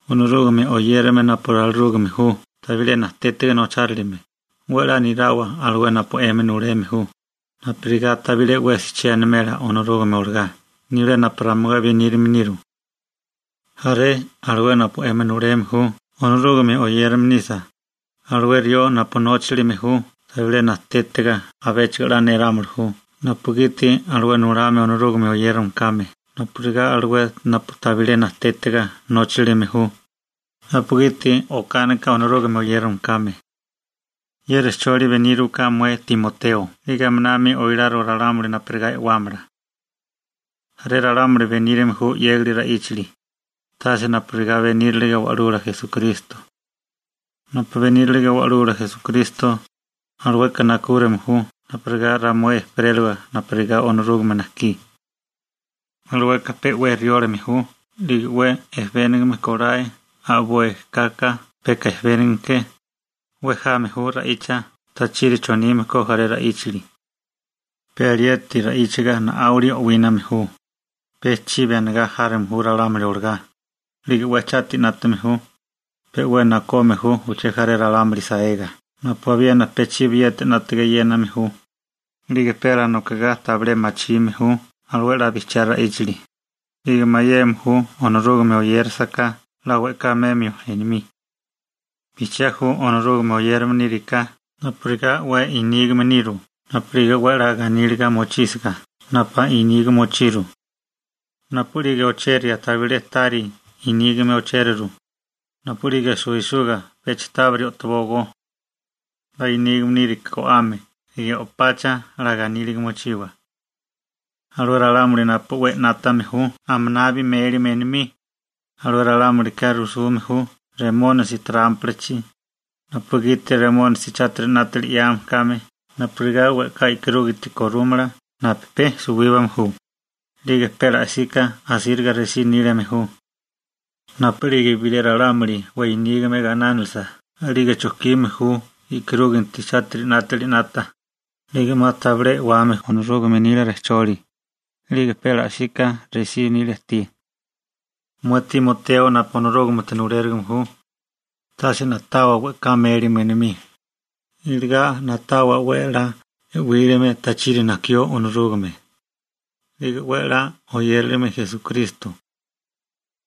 Onorúgame oyérame napu ralirúgame ju tabilé najtétiga nochárilime, 'we 'la nirawa alué napu 'emi nuleme ju, napurigá tabilé 'wesi che animela Onorúgame olagá nibilé napu ramué benírame niru. Jaré alué napu 'emi nuleme ju Onorúgame oyérame nisa, alué rió napu nochárilime ju tabilé najtétiga abéchigo 'la nirámili ju napugiti alué nulame Onorúgame oyérame kame napurigá alué napu tabilé najtétiga nócharilime ju, napugiti okánika Onorúgame oyérame kame. Ye rejcholi beníriwaká mué Timoteo 'lige aminami oiláriwa ralámuli napurigá e'wámala. Jaré ralámuli benírame ju 'yégali ra'íchali, tase napurigá benírilige Wa'lula Esukristo. Napu benírilige Wa'lula Esukristo, alueka najkúrime ju napurigá ramué ejperélawa napurigá Onorúgame najkí. Alueka pe 'we riólame ju 'lige 'we ejebénigame kolae a'boi kaka peka ejebénigame ke, 'we jame ju ra'icha tachiri chonime ko jaré ra'íchali. Pe alieti ra'íchiga na'áwili o'wíname ju, pe chibi anigá járome ju ralámuli olagá, 'lige 'we chátiri 'nátame ju, pe 'we nakome ju uché jaré ralámuli saega napu abiena pe chibiyeti 'nátaga e'yéname ju, 'lige pe alanokigá tabilé machime ju alué 'la bijchiá ra'íchali, 'lige mayeme ju Onorúgame oyérasaká 'la we'ká memio enomí. Bijchiá ju Onorúgame oyérame níriká napurigá 'we i'nígame niru napu'lige 'we 'la ganíliga mochísiga napu niga mochiru. Napu'lige ocheria tabilé tábiri niga ochériru, napu'lige suwisuga pecha tábiri o'tobógó. 'La nígame níriká go'ame 'lige o'pacha 'la ganíliga mochiwa. Alué ralámuli napu 'we 'nátame ju aminabi méliame enomí, alué ralámulika rujsume ju Remónisi trámpalachi, napugiti Remónisi chátiri 'nátali 'yame kame napurigá we'ká e'karúginti korúmala napu pe suwíbame ju, 'lige pe ala'síká asíriga resí nílime ju. Napu'lige bilé ralámuli 'we nígame gainánilisa, a'lige chojkime ju e'karúganti chátiri 'nátali 'nata, 'lige 'ma tabilé e'wame ju Onorúgame nila rejcholi, 'lige pe la'sika 'we resí nilia ajtí. Mué Timoteo napu Onorúgamete nulérigime ju, tase na'tawa we'ká mélime enomí, iligá na'tawa 'we 'la e'wílame tachiri najkió Onorúgame, 'lige 'we 'la oyérilime Esukristo.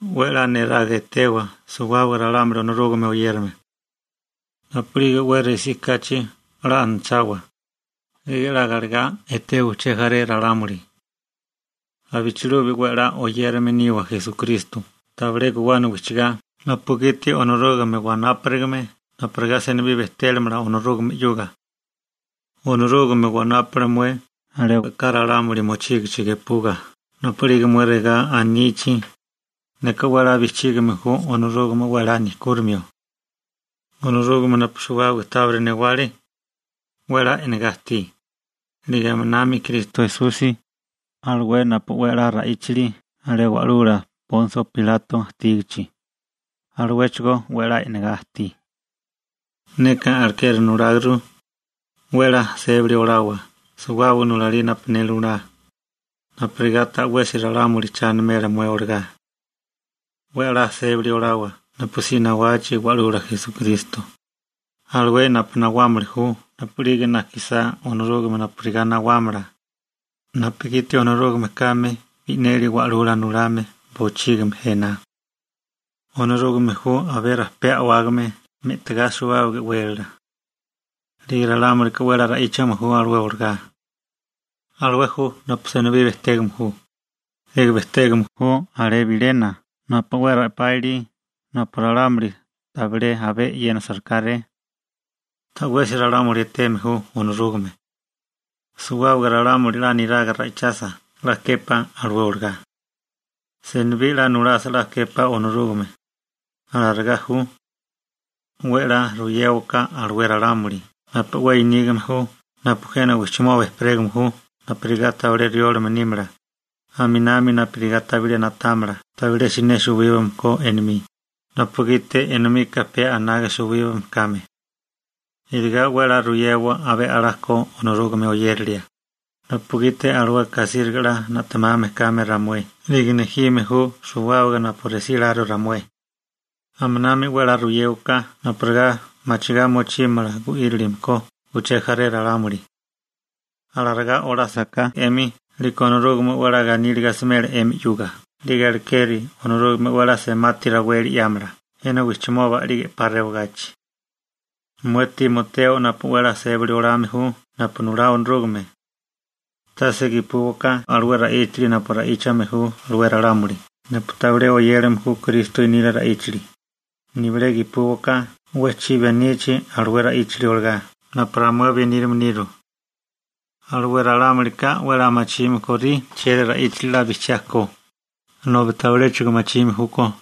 'We 'la niraga etewa suwábaga ralámuli Onorúgame oyérame. Napu'lige 'we resí kachi, 'la anachawa, 'lige 'la galegá etewa uché jaré ralámuli. Abichilubi 'we 'la oyérame niwa Esukristo tabilé guwana wijchigá napugiti Onorúgame wanáparigame napurigá senibí bejtéramala Onorúgame 'yuga. Onorúgame wanápale mué alé we'ká ralámuli mochígichi gepuga napu'lige mué regá anichi: «Neka 'we 'la bijchígime ju Onorúgame 'we 'la nejkúrimio.» Onorúgame napu suwábaga tábiri newale, 'we 'la e'negá ajtí, 'lige aminami Kristo Esusi, alué napu 'we 'la ra'íchale alé wa'lula Ponsio Pilato ajtígichi, aluéchigo 'we 'la e'negá ajtí. Neka alekeri nuláguru: 'We 'la sébili olawa suwábaga nulalí napu ne nulá, napurigá ta'wesi ralámuli cha animela mué olagá. 'We 'la sébali olawa napusí nawachi Wa'lula Esukristo, alué napu nawámili ju napu'lige najkisá Onorúgame napurigá nawámala, napugiti Onorúgame kame bi'neli Wa'lula Nulame bochígimi jena. Onorúgame ju abé rajpé a'wágame me'tigá suwábaga e'wélala. 'Lige ralámulika 'we 'la ra'íchame ju alué olagá. Alué ju napu senibí bejtégame ju, 'lige bejtégame ju alé bilena napu 'we rapá ilí napu ralámuli tabilé abé e'yénasarikáré. Ta'wesi ralámuli eteme ju Onorúgame. Suwábaga ralámuli 'la niraga ra'ichasa 'la képá alué olagá. Senibí 'la nulasa 'la képá Onorúgame. Alarigá ju. 'We 'la ruyéwaká alué ralámuli napu 'we i'nígame ju napu jena wijchimoba ejperégame ju napurigá tabilé riólame nímala, aminami napurigá tabilé na'támala tabilé siné suwíbame ko enomí, napugiti enomika pe anaga suwíbame kame. Iligá 'we 'la ruyewa abé a'lá ko Onorúgame oyérilia, napugiti alueka asíriga 'la na'temame kame ramué 'lige nejime ju suwábaga napu resíláru ramué. Aminami 'we 'la ruyéwaká napurigá machigá mochímala gu'írilime ko uché jaré ralámuli. Alarigá olásaká 'emi 'liko Onorúgame 'we 'la ganíliga asimela 'emi 'yuga, 'lige alekeri Onorúgame 'we 'la semati raweli 'yámala jena wijchimoba 'lige 'pa rewagachi. Mué Timoteo napu 'we a'lá sébali olame ju napu nulá Onorúgame, tase gepúwaká alué ra'íchali napu ra'íchame ju alué ralámuli napu tabilé oyérame ju Kristo nila ra'íchali, nibilé gepúwaká 'we chibi anichi alué ra'íchali olagá napu ramué benírame niru. Alué ralámulika 'we 'la machime kórí chieri ra'íchali 'la bijchiá ko, nobi tabiléchigo machime júkó.